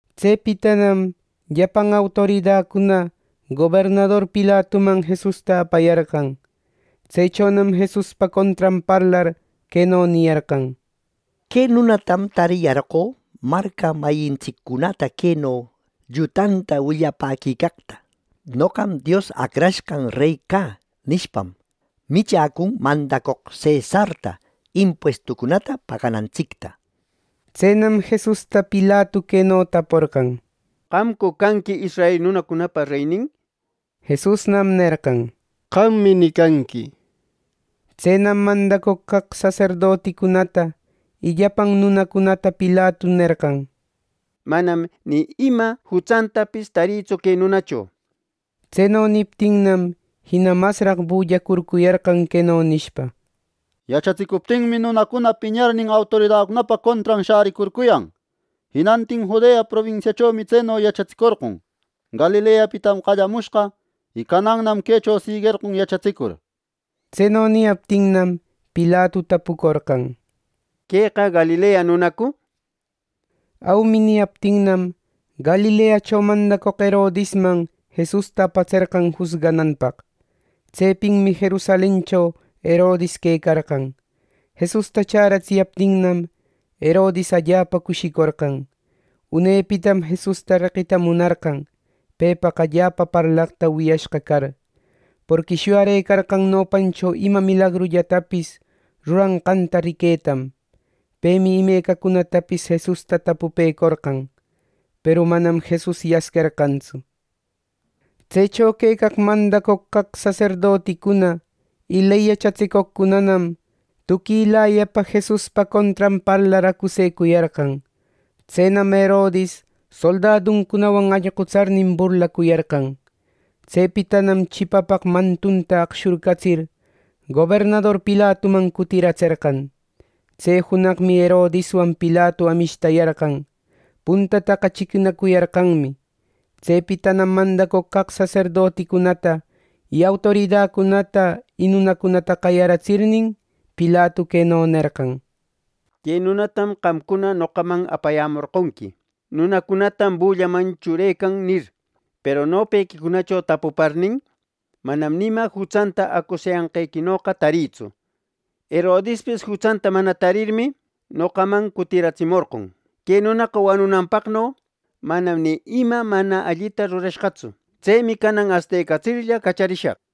Tsepitanam llapan autoridacuna gobernador Pilatuman Jesusta apayarqan. Tsechonam Jesuspa contran parlar queno niyarqan: —Que nunatam tariyarqö marca mayintsiccunata queno llutanta willapäquicaqta: ‘Noqam Dios Acrashqan rey cä’ nishpam, michäcun mandacoq cesarta impuestucunata paganantsicta. Tsenam, Jesusta Pilatu queno taporqan: —¿Qamcu canqui israel nunacunapa reynin? —nir. Jesusnam nerqan: —¡Qammi nicanqui! —nishpa. Tsenam mandacoq caq saserdoticunata y llapan nunacunata Pilatu nerqan: —Manam ni ima jutsantapis tarïtsu que nunacho —nir. Tseno niptinnam, jina masraq bullacurcuyarqan queno nishpa: —Yachatsicuptinmi, nunacuna piñarnin autoridacunapa contran shäricurcuyan. Jinantin Judea probinsiachomi tseno yachatsicorqon. Galileapitam qallamushqa, y canannam quecho siguerqon yachatsicur. Tseno niyaptinnam, Pilatu tapucorqan: —¿Queqa Galilea nunacu? —nishpa. “Aumi” niyaptinnam, Galileacho mandacoq Herodisman Jesusta apatserqan jusgananpaq. Tsepinmi Jerusalencho Herodis quecarqan. Jesusta chäratsiyaptinnam, Herodis allapa cushïcorqan. Unepitam Jesusta reqita munarqan, pepaq allapa parlaqta wiyashqa car. Porqui shuyecarqan nopancho ima milagrullatapis ruranqanta riquetam. Pemi imecacunatapis Jesusta tapupecorqan. Peru manam Jesus yasquerqantsu. Tsecho quecaq mandacoq caq saserdoticuna y ley yachatsicoqcunanam tuquilayapa Jesuspa contran parlar acusecuyarqan. Tsenam Herodis soldaduncunawan allqutsarnin burlacuyarqan. Tsepitanam chipapaq mantuta aqshurcatsir, gobernador Pilatuman cutiratserqan. Tse junaqmi Herodiswan Pilatu amishtayarqan. Puntataqa chiquinacuyarqanmi. Tsepitanam mandacoq caq saserdoticunata, autoridacunata y nunacunata qayaratsirnin, Pilatu queno nerqan: —Que nunatam qamcuna noqaman apayämorqonqui ‘Nunacunatam bullaman churecan’ nir. Peru nopequicunacho tapuparnin, manam ni ima jutsanta acusayanqequinoqa tarïtsu. Herodispis jutsanta mana tarirmi, noqaman cutiratsimorqon. ¡Que nunaqa wanunanpaqno manam ni ima mana allita rurashqatsu! Tsemi canan astecatsirlla, cacharishaq.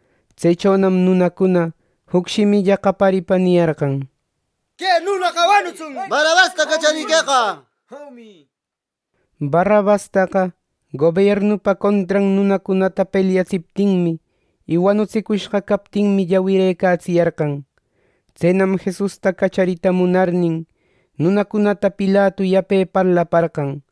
Tsechonam nunacuna juc shimilla qayaripa niyarqan: —¡Que nunaqa wanutsun! ¡Barrabasta cachariqueqa! —nishpa. Barrabastaqa gobiernupa contran nunacunata pelyatsiptinmi, y wanutsicushqa captinmi, llawirëcatsiyarqan. Tsenam Jesusta cacharita munarnin, nunacunata Pilatu yape parlaparqan.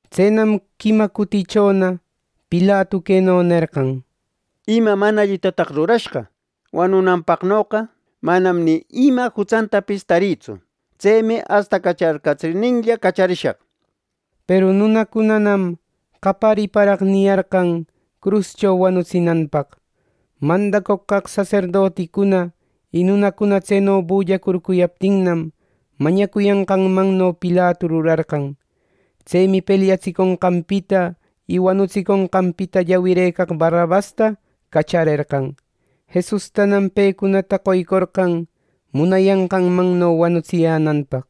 Tsenam quima cutichona Pilatu queno nerqan: —¿Ima mana allitataq rurashqa? Wanunanpaqnoqa manam ni ima jutsantapis tarïtsu. Tsemi astacacharcatsirninlla cacharishaq. Peru nunacunanam qayariparaq niyarqan cruscho wanutsinanpaq. Mandacoq caq saserdoticuna y nunacuna tseno bullacurcuyaptinnam, mañacuyanqanno Pilatu rurarqan. Tsemi pelyatsiconqanpita, y wanutsiconqanpita llawirëcaq Barrabasta cacharerqan. Jesustanam pecunata qoycorqan munayanqanno wanutsiyänanpaq.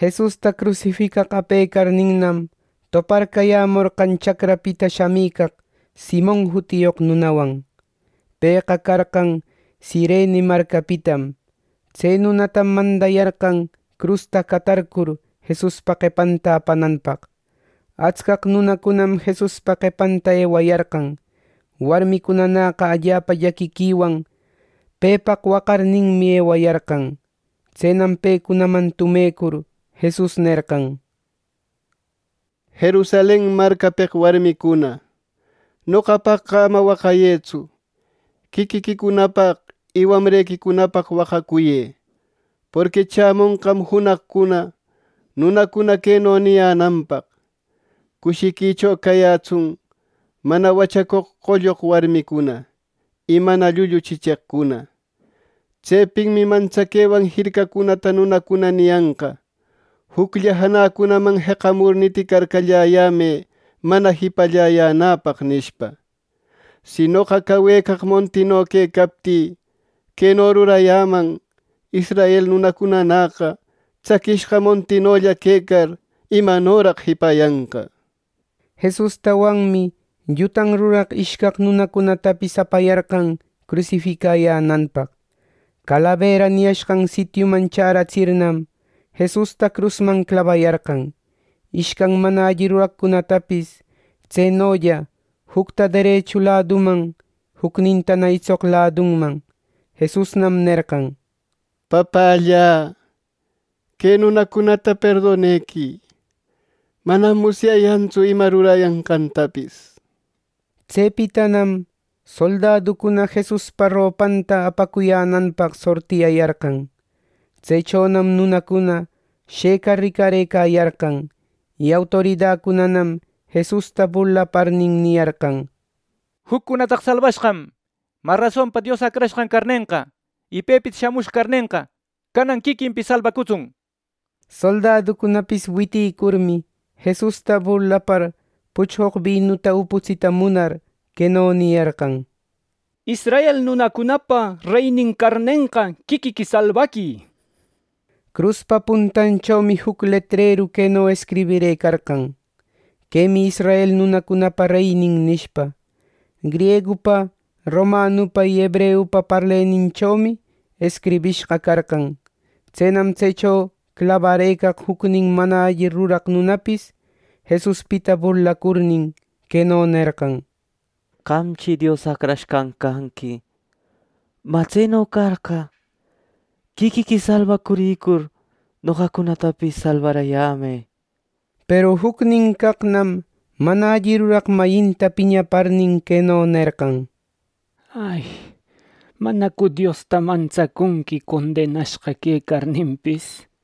Jesusta crusificaq apecarninnam, toparcayämorqan chacrapita shamicaq Simon jutiyoq nunawan. Pëqa carqan Cirene marcapitam. Tse nunatam mandayarqan crusta catarcur, Jesuspa qepanta apananpaq. Atscaq nunacunam Jesuspa qepanta ewayarqan. Warmicunanäqa allapa llaquiquiwan pepaq waqarninmi ewayarqan. Tsenam pecunaman tumecur Jesus nerqan: —Jerusalen marcapeq warmicuna, noqapaqqa ama waqayëtsu. Quiquiquicunapaq y wamrequicunapaq waqayëqa. Porqui chämonqam junaqcuna nunacuna queno niyänanpaq: ‘¡Cushiquicho cayätsun mana wachacoq qolloq warmicuna, y mana llullu chicheqcuna.’ Tsepinmi mantsaquewan jircacunata nunacuna niyanqa, ‘Juclla janäcunaman jeqamur niticarcalläyämë mana jipalläyänäpaq!’ nishpa. Si noqa, cawecaq montino quecaptï, queno rurayäman; israel nunacunanäqa tsaquishqa montinolla quecar, ¿imanoraq jipayanqa? Jesustawanmi llutan ruraq ishcaq nunacunatapis apayarqan crusificayänanpaq. Calabera niyashqan sitiuman chäratsirnam, Jesusta crusman clabayarqan, ishcan mana alli ruraqcunatapis tsenolla, jucta derechu ladunman, jucnintana itsoq ladunman. ˻Jesusnam nerqan: —Papällä, que nunacunata perdonequï. Manam musyayantsu ima rurayanqantapis.˼ Tsepitanam soldaducuna Jesuspa ropanta apacuyänanpaq sortiyayarqan. Tsechonam nunacuna shëcar ricarëcayarqan. Y autoridacunanam Jesusta burlaparnin niyarqan: —Juccunataqa salbashqam. Mä rasonpa, Dios Acrashqan carnenqa, y pepita shamushqa carnenqa, canan quiquinpis salbacutsun. Soldaducunapis witïcurmi, Jesusta burlapar puchqoq binuta uputsita munar, queno niyarqan: —¡Israel nunacunapa reynin carnenqa, quiquiqui salbaquï! Cruspa puntanchomi juc letreru queno escribirëcarqan: “Quemi israel nunacunapa reynin” nishpa. ˻Griegupa, romanupa y hebreupa parleninchomi escribishqa carqan.˼ Tsenam tsecho clabarëcaq jucnin mana alli ruraq nunapis Jesuspita burlacurnin, queno nerqan: —Qamchi Dios Acrashqan canqui. Mä, tseno carqa, quiquiqui salbacurïcur noqacunatapis salbarayämë. Peru jucnin caqnam mana alli ruraq mayinta piñaparnin, queno nerqan: —¿Manacu Diosta mantsacunqui condenashqa quecarninpis?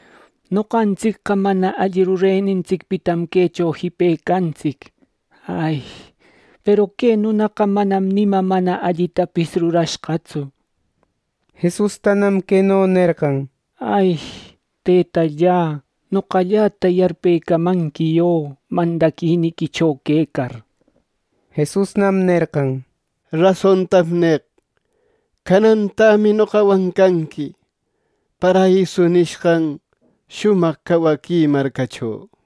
Noqantsicqa mana alli rurenintsicpitam quecho jipecantsic. Peru que nunaqa manam ni ima mana allitapis rurashqatsu. Jesustanam queno nerqan: —Tëtalla, noqalläta yarpecamanqui yö mandaquiniquicho quecar. Jesusnam nerqan: —Rasontam neq: Canantämi noqawan canqui paraiso nishqan shumaq cawaqui marcacho.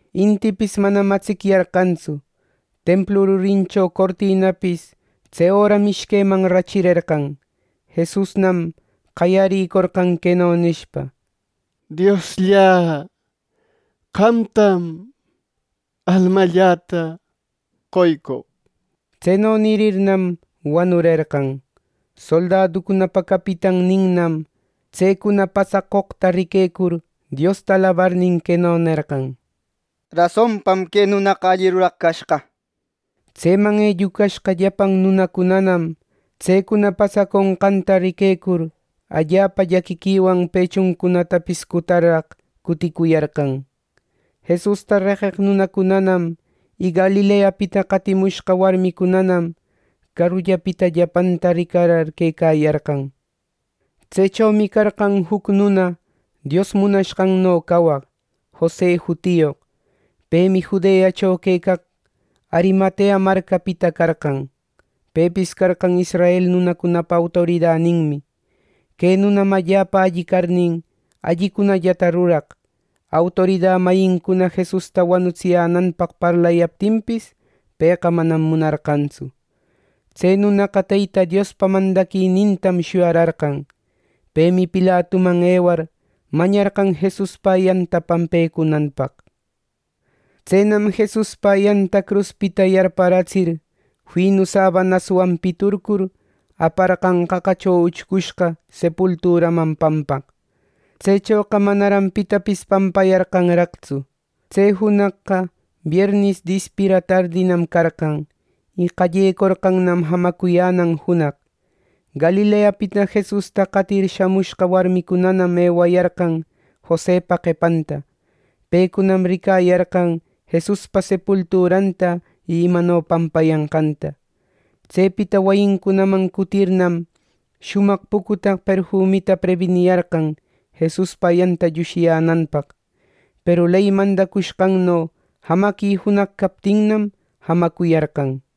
Intipis manam atsicyarqantsu. Templu rurincho cortinapis tse öram ishqueman rachirerqan. Jesusnam qayaricorqan queno nishpa: —¡Diosllä, qamtam almalläta qoycoq! Tseno nirirnam wanurerqan. Soldaducunapa capitanninnam tsecuna pasacoqta riquecur Diosta alabarnin, queno nerqan: —Rasonpam que nunaqa alli ruraq cashqa. Tseman ellucashqa llapan nunacunanam tsecuna pasaconqanta riquecur, allapa llaquiquiwan pechuncunatapis cutarraq cuticuyarqan. Jesusta reqeq nunacunanam y Galileapita qatimushqa warmicunanam carullapita llapanta ricarar quecayarqan. Tsechomi carqan juc nuna Dios munashqanno cawaq, Jose jutiyoq. Pemi Judeacho quecaq Arimatea marcapita carqan. Pepis carqan israel nunacunapa autoridaninmi. Que nunam allapa alli carnin, allicunallata ruraq. Autorida mayincuna Jesusta wanutsiyänanpaq parlayaptinpis, pëqa manam munarqantsu. Tse nunaqa Teyta Diospa mandaquinintam shuyararqan. Pemi Pilatuman ewar, mañarqan Jesuspa ayanta pampecunanpaq. Tsenam Jesuspa ayanta cruspita yarpäratsir, finu sabanaswan piturcur, aparqan qaqacho uchcushqa sepulturaman pampaq. Tsechoqa manaran pitapis pampayarqanraqtsu. Tse junaqqa biernis dispira tardinam carqan, y qallecorqannam jamacuyänan junaq. Galileapita Jesusta qatir shamushqa warmicunanam ewayarqan Josepa qepanta. Pecunam ricayarqan Jesuspa sepulturanta y imano pampayanqanta. Tsepita wayincunaman cutirirnam, shumaq pucutaq perfumita prebiniyarqan Jesuspa ayanta llushiyänanpaq. Peru ley mandacushqanno, jamaqui junaq captinnam, jamacuyarqan.